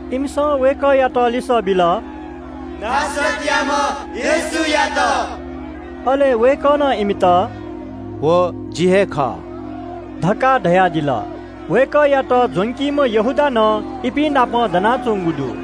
इमिसं वय्‌कःयात लिसः बिल – “नासरतयाम्‍ह येशूयात।” अले वय्‌कलं इमित – “व जि हे खः” धकाः धयादिल। वय्‌कःयात ज्‍वंकीम्‍ह यहूदा नं इपिं नाप दनाच्‍वंगु दु।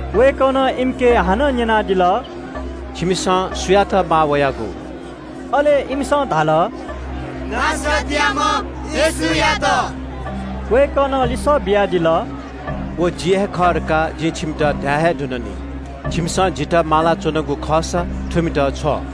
वय्‌कलं इमिके हानं न्‍यनादिल – “छिमिसं सुयात माः वयागु?” अले इमिसं धाल – “नासरतयाम्‍ह येशूयात।” वय्‌कलं लिसः बियादिल – “व जि हे खः धकाः जिं छिमित धाये हे धुन नि। छिमिसं जितः माला च्‍वनागु खःसा थुमित वनेब्‍यु।”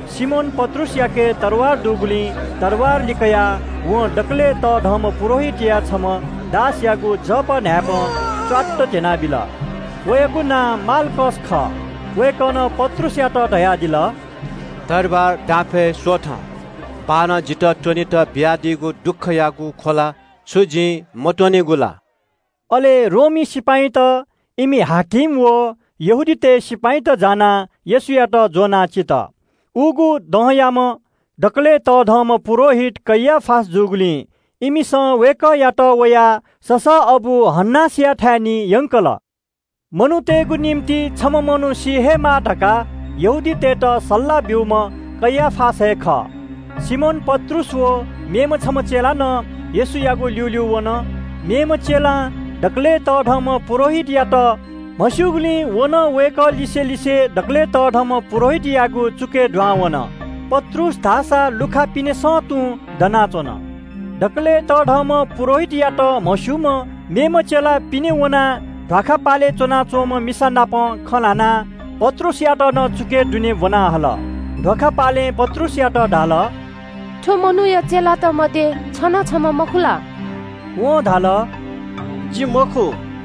सिमोन पत्रुसयाके तरवार दुगुलिं तरवार लिकयाः वं दकलय् तःधंम्‍ह पुजाहारीया छम्‍ह दासयागु जव न्‍हाय्‌पं च्‍वात्त ध्‍यनाबिल। वयागु नां माल्‍खस खः। वय्‌कलं पत्रुसयात धयादिल – “तरवार दापय् स्‍वथँ। बाःनं जितः त्‍वनेत बियादीगु दुःखयागु ख्‍वला छु जिं मत्‍वनेगु ला?” अले सिपाइँत, इमि हाकिम व यहूदीतय् सिपाइँत जानाः येशूयात ज्‍वनाः चित। उगु दँयाम्‍ह दकलय् तःधंम्‍ह पुजाहारी कैयाफा जूगुलिं इमिसं वय्‌कःयात वया ससःअबु हन्‍नासया थाय् निं यंकल। झी मनूतय्‌गु निंतिं छम्‍ह मनू सीगु हे बांलाः धकाः यहूदीतय् नायःतय्‌त सल्‍लाह ब्‍यूम्‍ह कैयाफा हे खः। सिमोन पत्रुस व मेम्‍ह छम्‍ह चेला नं येशूयागु ल्‍यूल्‍यू वन। मेम्‍ह चेलां दकलय् तःधंम्‍ह पुजाहारीयात म्‍हस्‍यूगुलिं व नं वय्‌कः लिसे लिसे दकलय् तःधंम्‍ह पुजाहारीयागु चुकय् दुहां वन। पत्रुस धाःसा लुखा पिनेसं तुं दनाच्‍वन। दकलय् तःधंम्‍ह पुजाहारीयात म्‍हस्‍यूम्‍ह मेम्‍ह चेला पिने वनाः मिसाम्‍ह ध्‍वाखा पिवाः नाप खँ ल्‍हानाः पत्रुसयात नं चुकय् दुने ब्‍वना हल। मिसाम्‍ह ध्‍वाखा पिवालं पत्रुसयात धाल – “थ्‍व मनूया चेलात मध्‍ये छ नं छम्‍ह मखु ला?” वं धाल “जि मखु।”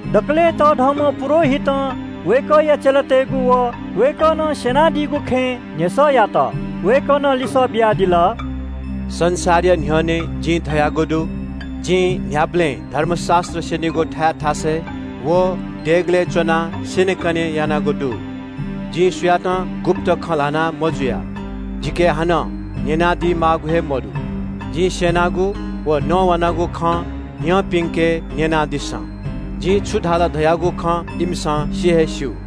दकलय् तःधंम्‍ह पुजाहारीं वय्‌कःया चेलातय्‌गु व वय्‌कलं स्‍यनादीगु खँय् न्‍ह्यसः यात। वय्‌कलं लिसः बियादिल – “संसारया न्‍ह्यःने जिं धयागु दु, जिं न्‍ह्याबलें धर्मशास्‍त्र स्‍यनीगु थाय् थासय् व देगलय् च्‍वनाः स्‍यनेकने यानागु दु। जिं सुयातं गुप्‍त खँ ल्‍हाः मजुया। जिके हानं न्‍यनादी माःगु हे मदु। जिं स्‍यनागु व नवानागु खँ न्‍यंपिन्‍के न्‍यनादिसँ। जिं छु धाल धयागु खँ इमिसं सि हे स्‍यू।”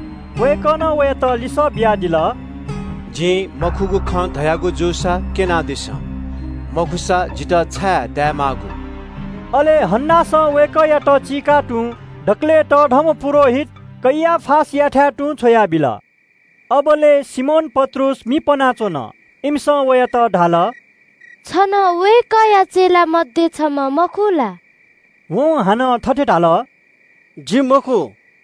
वय्‌कलं वयात लिसः बियादिल – “जिं मखुगु खँ धयागु जूसा क्‍यनादिसँ। मखुसा जितः छाय् दाये माःगु?” अले हन्‍नासं वय्‌कःयात चीकाः दकलय् तःधंम्‍ह पुजाहारी कैयाफायाथाय् तुं छ्वयाबिल। अबलय् सिमोन पत्रुस दनाः मि पनाच्‍वन। इमिसं वयात धाल – “छ नं वय्‌कःया चेलात मध्‍ये छम्‍ह मखु ला?” वं हानं थथे धाल – “जि मखु।”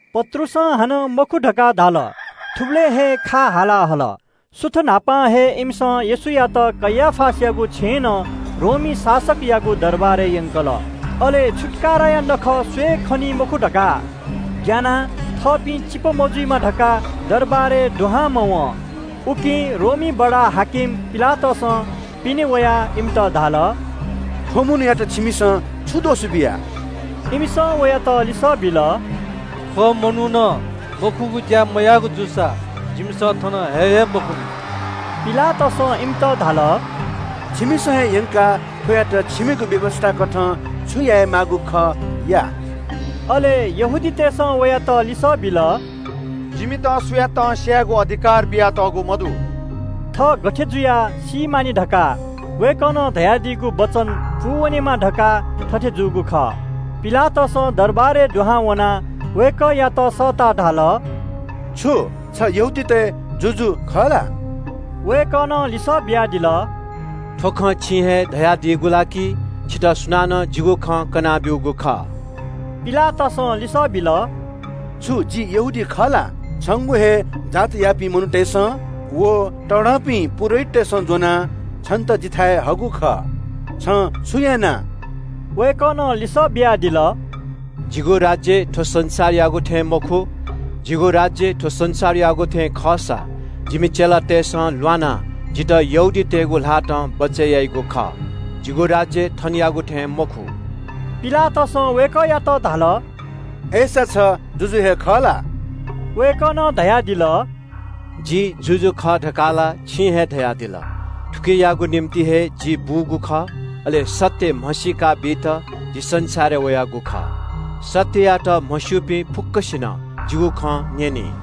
पत्रुसं हानं “मखु” धकाः धाल। थुबलय् हे खा हाला हल। सुथ न्‍हापां हे इमिसं येशूयात कैयाफायागु छेँनं रोमी बडा-हाकिम पिलातसयागु दरबारय् यंकल। छुत्‍काराया नखः स्‍वये खनी मखु धकाः ग्‍यानाः थःपिं अशुद्ध मजुइमा धकाः दरबारय् दुहां मवं। उकिं पिलातसं पिने वयाः इमित धाल – “थ्‍व मनूयात छिमिसं छु दोष बिया?” इमिसं वयात लिसः बिल – “थ्‍व मनुखं मखुगु ज्‍या मयाःगु जूसा जिमिसं थन हये हे मखुनि।” पिलातसं इमित धाल – “छिमिसं हे यंकाः थ्‍वयात छिमिगु व्‍यवस्‍थाकथं छु यायेमाःगु खः, या।” अले यहूदीतय् नायःतय्‌सं वयात लिसः बिल – “जिमित सुयातं स्‍यायेगु अधिकार बियातःगु मदु।” थः गथे जुयाः सी मानि धकाः वय्‌कलं धयादीगु वचन पूवनेमा धकाः थथे जूगु खः। पिलातसं लाय्‌कुलिइ दुहां वनाः वय्‌कःयात सःताः धाल – “छु छ यहूदीतय् जुजु खः ला?” वय्‌कलं लिसः बियादिल – “थ्‍व खँ छिं हे धयादियागु ला कि छितः सुनानं जिगु खँ कना ब्‍यूगु खः?” पिलातसं लिसः बिल – “छु जि यहूदी खः ला? छंगु हे जातयापिं मनूतय्‌सं व तःधंपिं पुजाहारीतय्‌सं ज्‍वनाः छन्‍त जिथाय् हःगु खः। छं छु याना?” वय्‌कलं लिसः बियादिल – “जिगु राज्‍य थ्‍व संसारयागु थें मखु। जिगु राज्‍य थ्‍व संसारयागु थें खःसा जिमि चेलातय्‌सं ल्‍वानाः जितः यहूदीतय् नायःतय्‌गु ल्‍हातं बचय् याइगु खः। जिगु राज्‍य थनयागु थें मखु।” पिलातसं वय्‌कःयात धाल – “अय्‌सा छ जुजु हे खः ला?” वय्‌कलं धयादिल – “जि जुजु खः धकाः ला छिं हे धयादिल। थुकियागु निंतिं हे जि बूगु खः, अले सत्‍य म्‍हसीका बीत जि संसारय् वयागु खः। सत्‍ययात म्‍हस्‍यूपिं फुक्‍कसिनं जिगु खँ न्‍यनी।”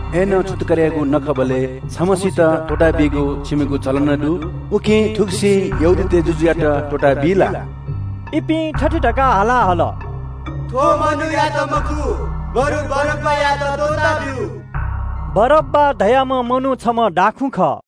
अय्‌नं छुत्‍काराया नखःबलय् छम्‍हय्‌सित त्‍वःताबीगु छिमिगु चलन दु, उकिं थुगुसी यहूदीतय् जुजुयात त्‍वःताबी ला?” इपिं थथे धकाः हाला हल “थ्‍व मनूयात मखु, बरु बारब्‍बायात त्‍वःताब्‍यु।” बारब्‍बा धाःम्‍ह मनू छम्‍ह दाखुँ खः।